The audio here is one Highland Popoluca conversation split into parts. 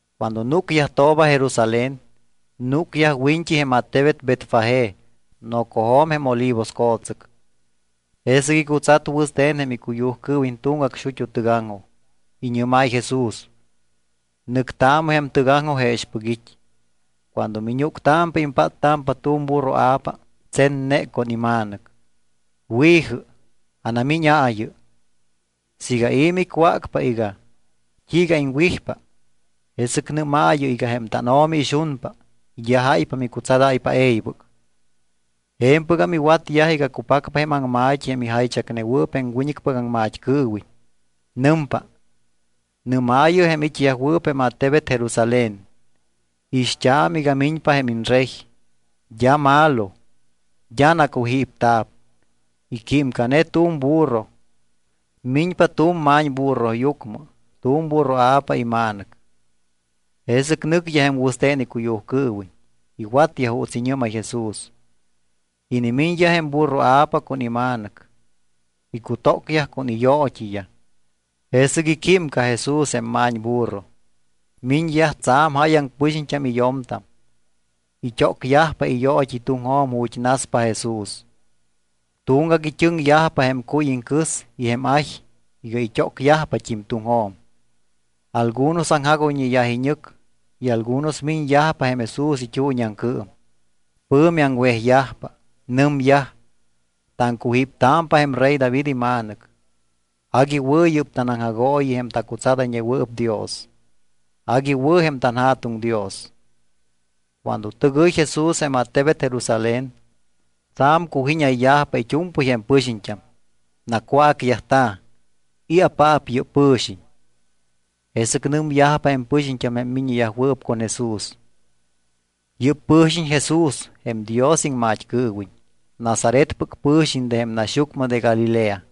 Cuando núcyajtooba Jerusalén, núcyaj wiñt́i jém attebet Betfagé nocojo̱m jém Olivos co̱tsɨc. Jesɨc icutsat wɨste̱n jém icuyujcɨɨwiñ tuŋgac xut́u tɨgaŋjoj. Iñɨ́máy Jesús: —Nɨctaamɨ jém tɨgaŋjoj jexpɨc it́. Cuando miñúctámpa impáttámpa tu̱m burroa̱pa tsenne con ima̱nɨc. Wi̱jɨ, anamíñaayɨ. Siiga i̱ micwácpa iga: “¿T́iiga iŋwijpa?” jesɨc nɨ́maayɨ iga jém tánO̱mi ixunpa y d́a jáypa micutsadáypa e̱ybɨc. Je̱mpɨgam iwatyaj iga cupacpa jém aŋma̱t́i jém ijaychacnewɨɨp jém wiñɨcpɨc aŋmat́cɨɨwiñ. Nɨmpa: Nɨ́maayɨ jém it́yajwɨɨp jém attebet Jerusalén: “Ixt́aamɨ iga miñpa jém iñRey. D́a malo, d́a nacujípta̱p. Iquímcane tu̱m burro. Miñpa tu̱m ma̱ñburroyucmɨ, tu̱m burroa̱pa ima̱nɨc.” Jesɨc nɨcyaj jém wɨste̱n icuyujcɨɨwiñ. Iwatyaj juuts iñɨ́máy Jesús. Inimiñyaj jém burroa̱pa con ima̱nɨc. Icutócyaj con iyoot́iyaj. Jesɨc iquímca Jesús jém ma̱ñburro. Miñyaj tsa̱m jáyaŋ pɨxiñt́am y yo̱mtam. It́ócyajpa iyoot́i tuŋjo̱m ju̱t́ naspa Jesús. Tuŋgac it́ɨŋyajpa jém cuy iŋcɨs y jém ay iga it́ócyajpat́im tuŋjo̱m. Algunos aŋjagoyñeyaj iñɨc y algunos miñyajpa jém Jesús it́uuñiaŋcɨɨm. Pɨ̱mi aŋwejyajpa. Nɨmyaj: —Taŋcujíptámpa jém rey David iMa̱nɨc. Agui wɨ̱ yɨ́p tanaŋjagooyi jém tacutsadayñewɨɨp Dios. Agui wɨ̱ jém tanJa̱tuŋ Dios. Cuando tɨgɨy Jesús jém attebet Jerusalén, tsa̱m cujínayyajpa it́u̱mpɨy jém pɨxiñt́am. Nacwácyajta̱: —¿I̱apaap yɨ́p pɨ̱xiñ? Jesɨc nɨmyajpa jém pɨxiñt́am jém miññeyajwɨɨp con Jesús: —Yɨ́p pɨ̱xiñ Jesús jém Dios iŋmat́cɨɨwiñ. Nazaretpɨc pɨ̱xiñ de jém naxyucmɨ de Galilea.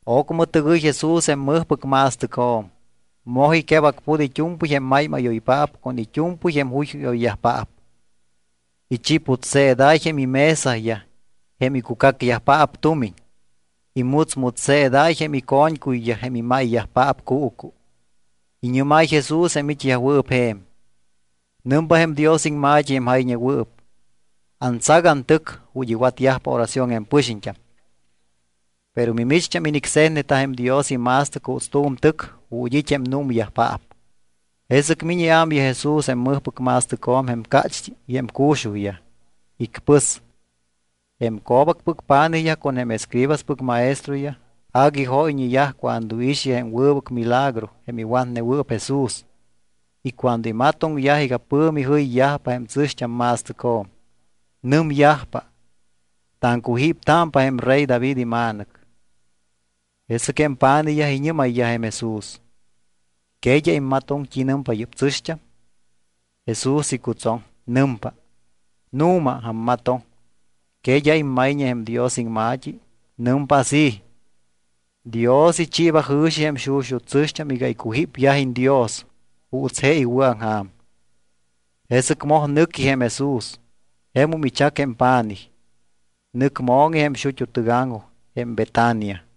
Ocmɨ tɨgɨy Jesús jém mɨjpɨc ma̱stɨcjo̱m. Moj iquebacput it́u̱mpɨy jém máymáyoyyajpaap con it́u̱mpɨy jém juyjúyoyyajpaap. Ichiputseedáy jém imesayaj jém icucacyajpaap tumiñ. Imutsmutsseedáy jém ico̱ñcuyyaj jém imáyyajpaap cuucu. Iñɨ́máy Jesús jém it́yajwɨɨp je̱m: —Nɨmpa jém Dios iŋma̱t́i jém jayñewɨɨp: “Antsac antɨc ju̱t́ iwatyajpa oración jém pɨxiñt́am.” Pero mimicht́am inicse̱tneta jém Dios ima̱stɨc juuts tu̱m tɨc ju̱t́ it́ jém númyajpaap. Jesɨc miñ iámyaj Jesús jém mɨjpɨc ma̱stɨcjo̱m jém cácht́i y jém cu̱xujyaj. Icpɨs. Jém co̱bacpɨc pa̱nijyaj con jém escribaspɨc maestroyaj agui jóyñeyaj cuando iixyaj jém wɨbɨc milagro jém iwatnewɨɨp Jesús y cuando imatoŋyaj iga pɨ̱mi jɨyyajpa jém tsɨ̱xt́am ma̱stɨcjo̱m, nɨmyajpa: “Taŋcujíptámpa jém rey David iMa̱nɨc.” Jesɨc jém pa̱nijyaj iñɨ́mayyaj jém Jesús: —¿Que d́a immatoŋ t́i nɨmpa yɨ́p tsɨ̱xt́am? Jesús icutsoŋ. Nɨmpa: —Nu̱ma, ammatoŋ. ¿Que d́a immayñe jém Dios iŋma̱t́i? Nɨmpa así: Dios ichiiba jɨ̱xi jém xuxut́ tsɨ̱xt́am iga icujípyajiñ Dios juuts je iwɨ̱aŋja̱m. Jesɨc moj nɨqui jém Jesús. Jemum ichac jém pa̱nij. Nɨc mo̱ŋi jém xut́u tɨgaŋjoj jém Betania.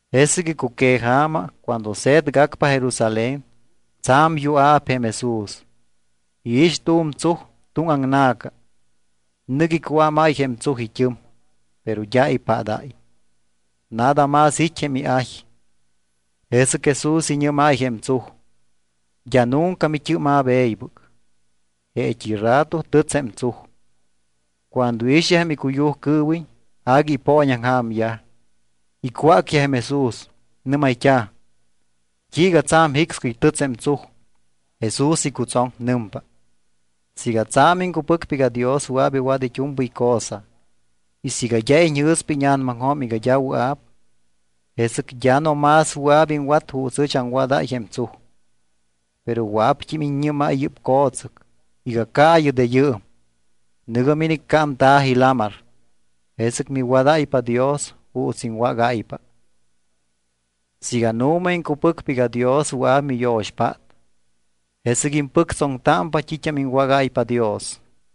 Jesɨc icuqueja̱ma, cuando se̱tgacpa Jerusalén, tsa̱m yua̱p jém Jesús. Iix tu̱m tsuj tuŋaŋna̱ca. Nɨc icuámáy jém tsuj it́ɨm, pero d́a ipadáy. Nada más it́ jém iay. Jesɨc Jesús iñɨ́máy jém tsuj: —D́a nunca mit́ɨ́ma̱p e̱ybɨc. Jeet́i rato tɨts jém tsuj. Cuando iixyaj jém icuyujcɨɨwiñ, agui ipooñaŋja̱myaj. Icwácyaj jém Jesús. Nɨ́mayt́a̱: —¿T́iiga tsa̱m jicscɨy tɨts jém tsuj? Jesús icutsoŋ. Nɨmpa: —Siiga tsa̱m iŋcupɨcpa iga Dios wɨa̱p iwat it́u̱mpɨy cosa y siiga d́a iñjɨ̱spa íña̱namaŋjo̱m iga d́a wɨa̱p, jesɨc d́a no más wɨa̱p iŋwat juuts ɨch aŋwadáy jém tsuj, pero wɨa̱pt́im iññɨ́máy yɨ́p co̱tsɨc iga caayɨ de yɨɨm, nɨ̱gɨ miniccámta̱ji lamar, jesɨc miwadáypa Dios juuts iŋwágáypa. Siiga nu̱ma iŋcupɨcpa iga Dios wɨa̱p miyo̱xpát, jesɨc impɨctsoŋpa t́it́am iŋwágáypa Dios.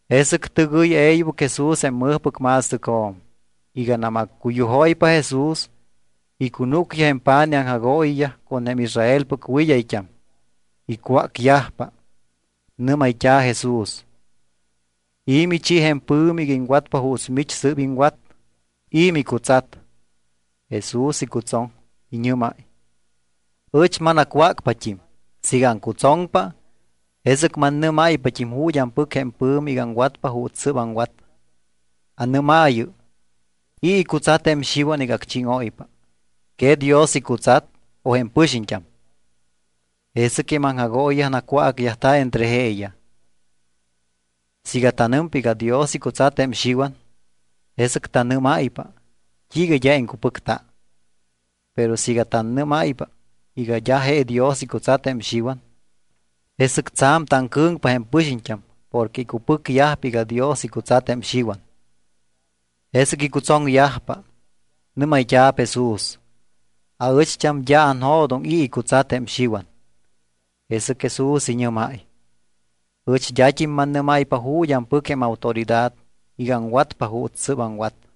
Jesɨc tɨgɨy e̱ybɨc Jesús jém mɨjpɨc ma̱stɨcjo̱m. Iganam accuyujóypa Jesús, icunúcyaj jém pa̱nij aŋjagooyiyaj con jém Israelpɨc wɨd́ayt́am. Icwácyajpa. Nɨ́mayt́a̱ Jesús: —¿I̱ michi jém pɨ̱mi iga iŋwatpa juuts mich sɨ́p iŋwat? ¿I̱ micutsat? Jesús icutsoŋ. Iñɨ́máy: —Ɨch manacwácpat́im, siiga aŋcutsoŋpa, jesɨc mannɨ́máypat́im ju̱t́ ampɨc jém pɨ̱mi iga aŋwatpa juuts sɨ́p aŋwat. Anɨ́maayɨ: ¿I̱ icutsat jém Xiwan iga acchíŋóypa? ¿Que Dios icutsat, o jém pɨxiñt́am? Jesɨc jém aŋjagooyiyaj nacwácyajta̱ entre jeeyaj: —Siiga tanɨmpa iga Dios icutsat jém Xiwan, jesɨc tanɨ́máypa: “¿T́iiga d́a iŋcupɨcta?” Pero siiga tannɨ́máypa iga d́a je Dios icutsat jém Xiwan, jesɨc tsa̱m taŋcɨ̱ŋpa jém pɨxiñt́am porque icupɨcyajpa iga Dios icutsat jém Xiwan. Jesɨc icutsoŋyajpa. Nɨ́mayt́a̱p Jesús: —Aɨcht́am d́a anjo̱doŋ i̱ icutsat jém Xiwan. Jesɨc Jesús iñɨ́máy: —Ɨch d́at́im mannɨ́máypa ju̱t́ ampɨc jém autoridad iga aŋwatpa juuts sɨ́p aŋwat.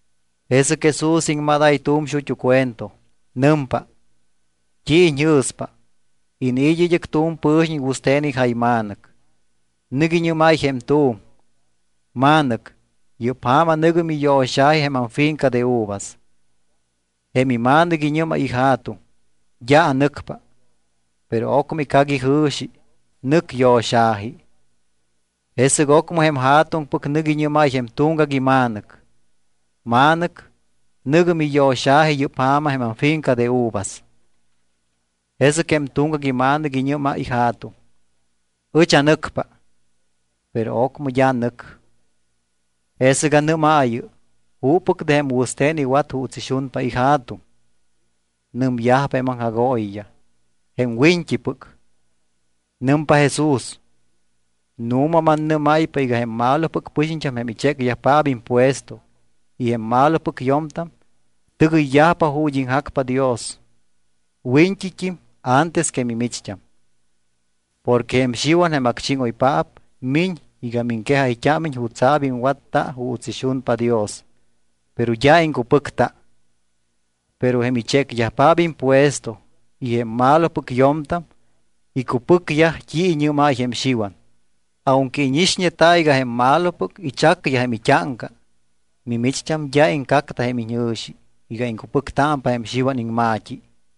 Jesɨc Jesús iŋmadáy tu̱m xut́u cuento. Nɨmpa: —¿T́i iñjɨ̱spa? Iniit́ id́ɨc tu̱m pɨ̱xiñ wɨste̱n ijayma̱nɨc. Nɨc iñɨ́máy jém tu̱m: “Ma̱nɨc, yɨ́p ja̱ma nɨ̱gɨ miyo̱xa̱ji jém amfinca de uvas.” Jém ima̱nɨc iñɨ́máy ija̱tuŋ: “D́a anɨcpa.” Pero ocmɨ icac ijɨ̱xi, nɨc yo̱xa̱ji. Jesɨc ocmɨ jém ja̱tuŋpɨc nɨc iñɨ́máy jém tuŋgac ima̱nɨc: “Ma̱nɨc, nɨ̱gɨ miyo̱xa̱ji yɨ́p ja̱ma jém amfinca de uvas.” Jesɨc jém tuŋgac ima̱nɨc iñɨ́máy ija̱tuŋ: “Ɨch anɨcpa.” Pero ocmɨ d́a nɨc. Jesɨc anɨ́maayɨ: ¿Juppɨc de jém wɨste̱n iwat juuts ixunpa ija̱tuŋ? Nɨmyajpa jém aŋjagooyiyaj: —Jém wiñt́ipɨc. Nɨmpa Jesús: —Nu̱ma mannɨ́máypa iga jém malopɨc pɨxiñt́am jém ichécyajpaap impuesto y jém malopɨc yo̱mtam tɨgɨyyajpa ju̱t́ iŋjacpa Dios wiñt́it́im antes que mimicht́am. Porque jém Xiwan jém acchíŋoypaap miñ iga miŋquejayt́ámiñ jutsa̱p iŋwatta juuts ixunpa Dios, pero d́a iŋcupɨcta. Pero jém ichécyajpaap impuesto y jém malopɨc yo̱mtam icupɨcyaj t́i iñɨ́máy jém Xiwan. Aunque íñixñeta iga jém malopɨc ichacyaj jém it́áŋca, mimicht́am d́a iŋcacta jém iñjɨ̱xi iga iŋcupɨctámpa jém Xiwan iŋma̱t́i.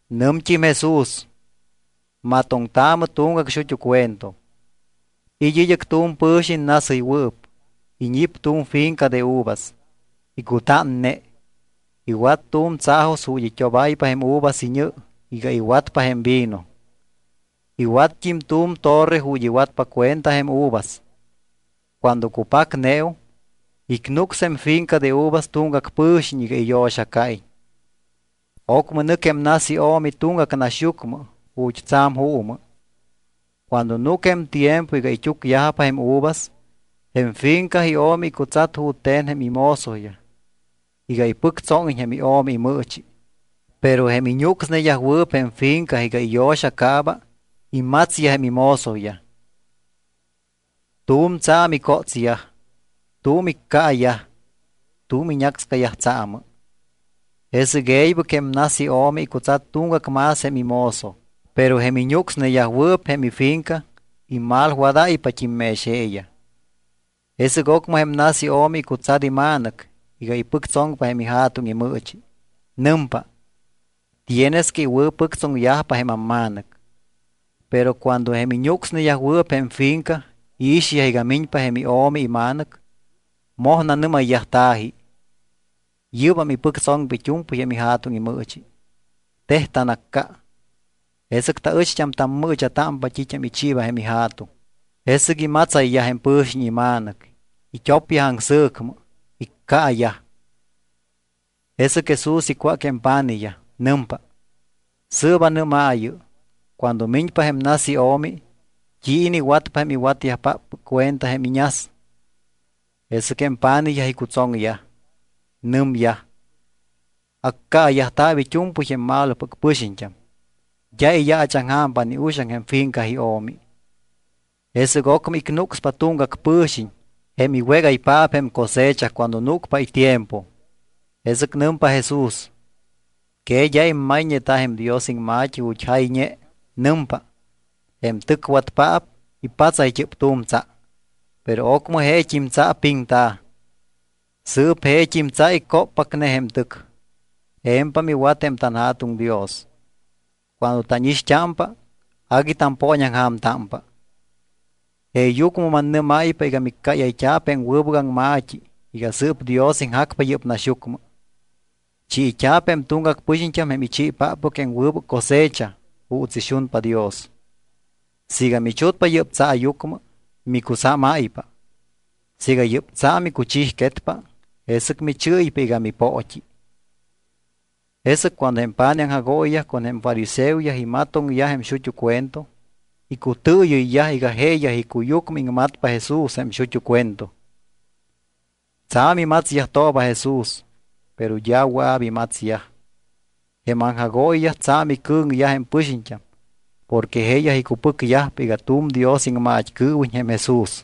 Nɨmt́im Jesús: —Matoŋtaamɨ tuŋgac xut́u cuento: It́ id́ɨc tu̱m pɨ̱xiñ nasɨywɨɨp. Iñip tu̱m finca de uvas. Icutánne. Iwat tu̱m tsaajos ju̱t́ it́obáypa jém uvas iñɨ iga iwatpa jém vino. Iwatt́im tu̱m torre ju̱t́ iwatpa cuenta jém uvas. ’Cuando cupacneum, icnucs jém finca de uvas tuŋgac pɨxiñt́am iga iyo̱xacaiñ. Ocmɨ nɨc jém nas io̱mi tuŋgac naxyucmɨ ju̱t́ tsa̱m juumɨ. Cuando núc jém tiempo iga it́úcyajpa jém uvas, jém finca io̱mi icutsat jute̱n jém imozoyaj iga ipɨctsóŋiñ jém io̱mi imɨɨchi. Pero jém iñucsneyajwɨɨp jém finca iga iyo̱xacaaba imatsyaj jém imozoyaj. Tu̱m tsa̱m icótsyaj, tu̱m iccaayaj, tu̱m iñácscayaj tsaamɨ. Jesɨc e̱ybɨc jém nas io̱mi icutsat tuŋgac más jém imozo, pero jém iñucsneyajwɨɨp jém ifinca imalwadayyajpat́im mex jeeyaj. ’Jesɨc ocmɨ jém nas io̱mi icutsat ima̱nɨc iga ipɨctsoŋpa jém ija̱tuŋ imɨɨchi. Nɨmpa: “Tienes que iwɨ̱pɨctsoŋyajpa jém amma̱nɨc.” Pero cuando jém iñucsneyajwɨɨp jém finca iixyaj iga miñpa jém io̱mi ima̱nɨc, moj nanɨ́mayyajta̱ji: “Yɨ́bam ipɨctsoŋpa it́u̱mpɨy jém ija̱tuŋ imɨɨchi. Tej tanacca, jesɨc taɨcht́am tamɨɨcha̱támpa t́it́am ichiiba jém ija̱tuŋ.” Jesɨc imatsayyaj jém pɨ̱xiñ ima̱nɨc. It́opyaj aŋsɨ̱cmɨ, iccaayaj. Jesɨc Jesús icwác jém pa̱nijyaj. Nɨmpa: —Sɨɨp anɨ́maayɨ: Cuando miñpa jém nas io̱mi, ¿t́i iniwatpa jém iwatyajpáppɨc cuenta jém iñas? Jesɨc jém pa̱nijyaj icutsoŋyaj, nɨmyaj: —Accaayajta̱p it́u̱mpɨy jém malopɨc pɨxiñt́am. D́a iyaachaŋja̱mpa ni uxaŋ jém finca io̱mi. Jesɨc ocmɨ icnucspa tuŋgac pɨ̱xiñ, jém iwégaypaap jém cosecha cuando núcpa itiempo. Jesɨc nɨmpa Jesús: —¿Que d́a immayñeta jém Dios iŋma̱t́i ju̱t́ jayñe? Nɨmpa: Jém tɨcwatpaap ipatsayt́ɨp tu̱m tsa. Pero ocmɨ jeet́im tsa piŋta̱. Sɨɨp jeet́im tsa icóppacne jém tɨc. Je̱mpam iwat jém tanJa̱tuŋ Dios. Cuando tánixt́ámpa, agui tampooñaŋja̱mtámpa. Jeeyucmɨ mannɨ́máypa iga miccáyayt́a̱p jém wɨbɨc aŋma̱t́i iga sɨɨp Dios iŋjacpa yɨ́p naxyucmɨ. Chiit́a̱p jém tuŋgac pɨxiñt́am jém ichiipaap jém wɨbɨc cosecha juuts ixunpa Dios. Siiga michutpa yɨ́p tsaayucmɨ, micusámáypa. Siiga yɨ́p tsa micuchijquetpa, jesɨc michɨ́ypa iga mipoot́i. Jesɨc cuando jém pa̱nij aŋjagooyiyaj con jém fariseoyaj imatoŋyaj jém xuxut́ cuento, icutɨɨyɨyyaj iga jeeyaj icuyucmɨ iŋmatpa Jesús jém xuxut́ cuento. Tsa̱m imatsyajtooba Jesús, pero d́a wɨa̱p imatsyaj. Jém aŋjagooyiyaj tsa̱m icɨ̱ŋyaj jém pɨxiñt́am porque jeeyaj icupɨcyajpa iga tu̱m Dios iŋmat́cɨɨwiñ jém Jesús.